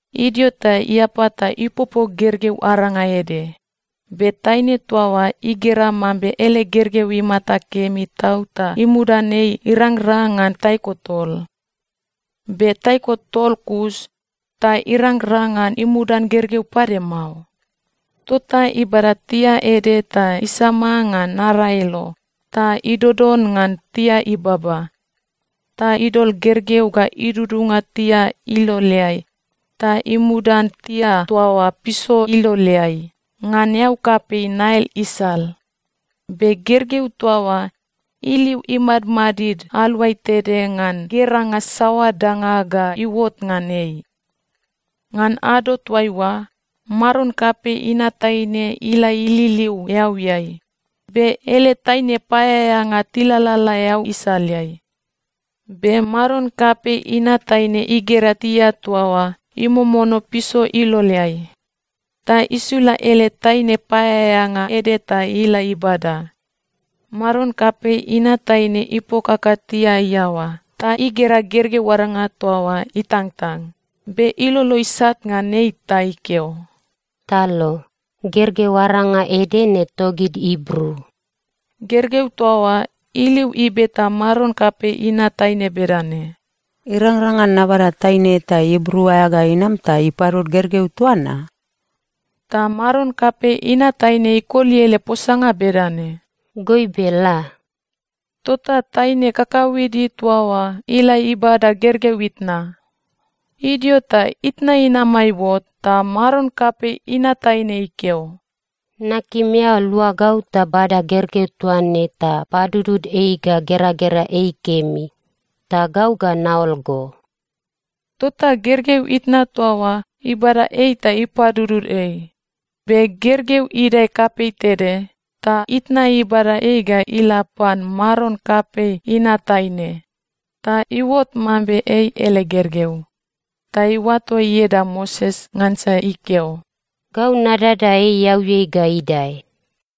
Idio ta iapa ta ipopo gergeu aranga ede. Be taine toa oa igera mambe ele gergeu imata kemi tau ta imudan ei irangrang ngan taiko tol. Be taiko tol kus ta irangrang ngan imudan gergeu pade mao. Tota ibada tia ede ta isama ngan naraelo ta idodon ngan tia ibaba. Ta idol gergeu ga idudunga tia iloleai ta imudan tia toa oa piso iloleai, ngan eau kapei Nail isal. Be gergeu toa oa iliu imadmadid aluai tede ngan geranga saoa danga ga iuot ngan ei. Ngan ado toaiua, maron kapei inat taine ila ililiu eauiai, be ele taine paeaeanga tilalala eau isaleai. Be maron kapei inat taine igera tia toa oa imomono piso iloleai, ta isula ele taine paeaeanga ede ta ila ibada. Maron kapei inat taine ipokaka tia iaoa ta igera gergeu aranga toa oa itangtang. Be ilolo isat ngan ei ta ikeo, “Talo. Gergeu aranga ede ne togid Ibru.” Gergeu toa oa iliu ibeta maron kapei inat taine bedane, “Irangrang ngan nabada taine eta Ibru aea ga inam ta ipadud gergeu toa na?” Ta maron kapei inat taine ikoli ele posanga bedane, “Goibe, la.” Tota taine kakauede toa oa ila ibada gergeu itna. Idio ta itna inama iuot, ta maron kapei inat taine ikeo, “Nakim eao lua gau ta bada gergeu toa ne ta padudud ei ga geragera ei kemi. Ta gau ga naol go.” Tota gergeu itna toa oa ibada ei ta ipadudud ei. Be gergeu idae kapei tede, ta itna ibada ei ga ila pan maron kapei inat taine, ta iuot mambe ei ele gergeu. Ta iuato ieda Moses ngansa ikeo, “Gau nadada ei eauiai ga idae.”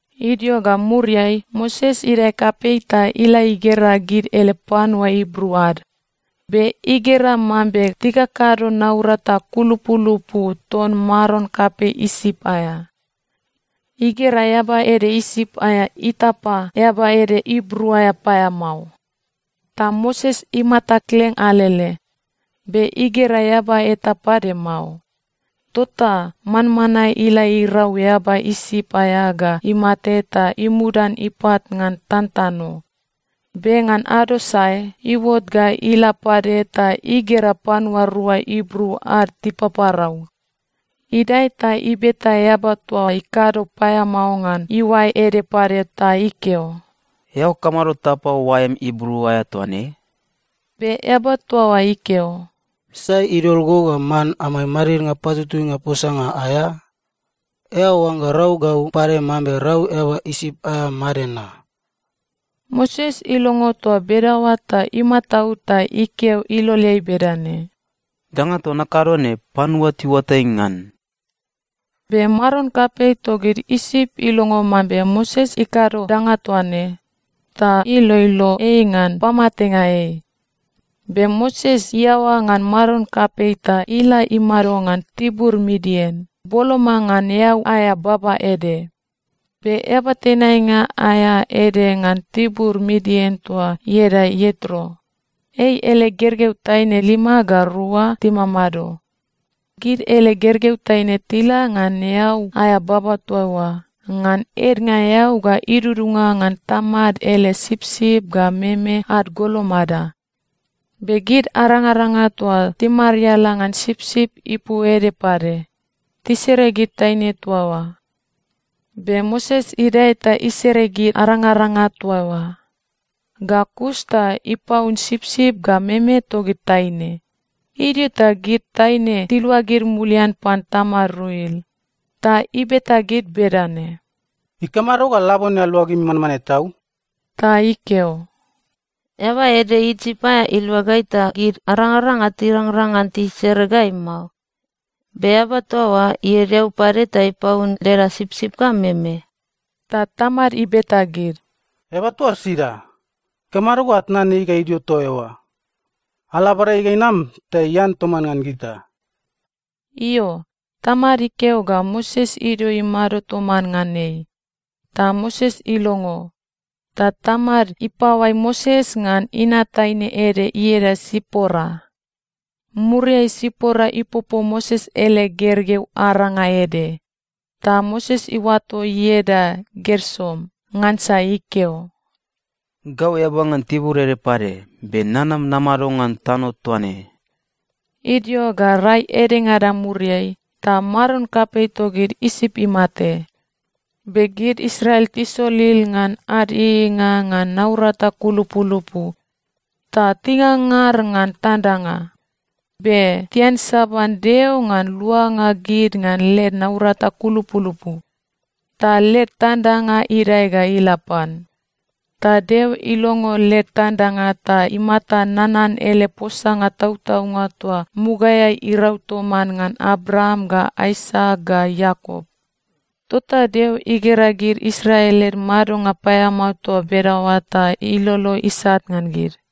Idio ga muriai Moses idae kapei ta ila igera gid ele panua Ibru ad. Be igera mambe tikakado naurata kulupulupu ton maron kapei Isip aea. Igera eaba ede Isip aea itapa eaba ede Ibru aea paeamao. Ta Moses imata kleng alele, be igera eaba eta pade mao, tota manmanae ila irau eaba Isip aea ga imate ta imudan ipat ngan tantano. Be ngan ado sae, iuot ga ila pade ta igera panua rua Ibru ad tipaparau. Idae ta ibeta eaba toa ikado paeamao ngan iuae ede pade ta ikeo, “Eao kamado tapa oaem Ibru aea toa ne?” Be eaba toa oa ikeo, “Sai idol go ga man amai madidnga patutuinga posanga aea? Eao oangga rau gau pade mambe rau eaba Isip aea made na?” Moses ilongo toa bedaoa ta imataud ta ikeo iloleai bedane, “Danga toa nakado ne, panua tiuatai ngan.” Be maron kapei togid Isip ilongo mambe Moses ikado danga toa ne, ta iloilo ei ngan pamatenga ei. Be Moses iaoa ngan maron kapei ta ila imado ngan tibur Midian, boloma ngan eau aea baba ede. Be eaba tenainga aea ede ngan tibur Midian toa ieda Ietro, ei ele gergeu taine lima ga rua timamado. Gid ele gergeu taine tila ngan eau aea baba toa oa ngan ednga eau ga idudunga ngan tamad ele sipsip ga meme ad golomada. Be gid arangaranga toa timariala ngan sipsip ipu ede pade, tisere gid taine toa oa. Be Moses idae ta isere gid arangaranga toa oa, ga kus ta ipaun sipsip ga meme togid taine. Idio ta gid taine tiluagid mulian pan tamad Ruel, ta ibeta gid bedane, “Ikamado ga labone aluagimi manmanae tau?” Ta tikeo, “Eaba ede Isip aea ilua gai ta gid arangaranga tirangrang ngan tisere gai mao. Be eaba toa oa ied eau pade ta ipaun leda sipsip ga meme.” Ta tamad ibeta gid, “Eaba toa oa sida? Ikamado ga atnan ei ga idio toa eoa? Ala abada ei ga inam ta ian toman ngan gita.” Io, tamad ikeo ga Moses idio imado toman ngan ei, ta Moses ilongo. Ta tamad ipaoai Moses ngan inat taine ede ieda Sipora. Muriai Sipora ipopo Moses ele gergeu aranga ede, ta Moses iuato ieda Gersom, ngansa ikeo, “Gau eaba ngan tibur ede pade, be nanam namado ngan tano toa ne.” Idio ga rai edengada muriai ta maron kapei togid Isip imate. Be gid Israel tisolil ngan ad ieieinga ngan naurata kulupulupu, ta tingangar ngan tandanga. Be tiansaban Deo ngan luanga gid ngan led naurata kulupulupu. Ta led tandanga idae ga ila pan. Ta Deo ilongo led tandanga ta imata nanan ele posanga tautaunga toa mugaeai irau toman ngan Abraam ga Aisak ga Iakop. Tota Deo igera gid Israel led madonga paeamao toa bedaoa ta ilolo isat ngan gid.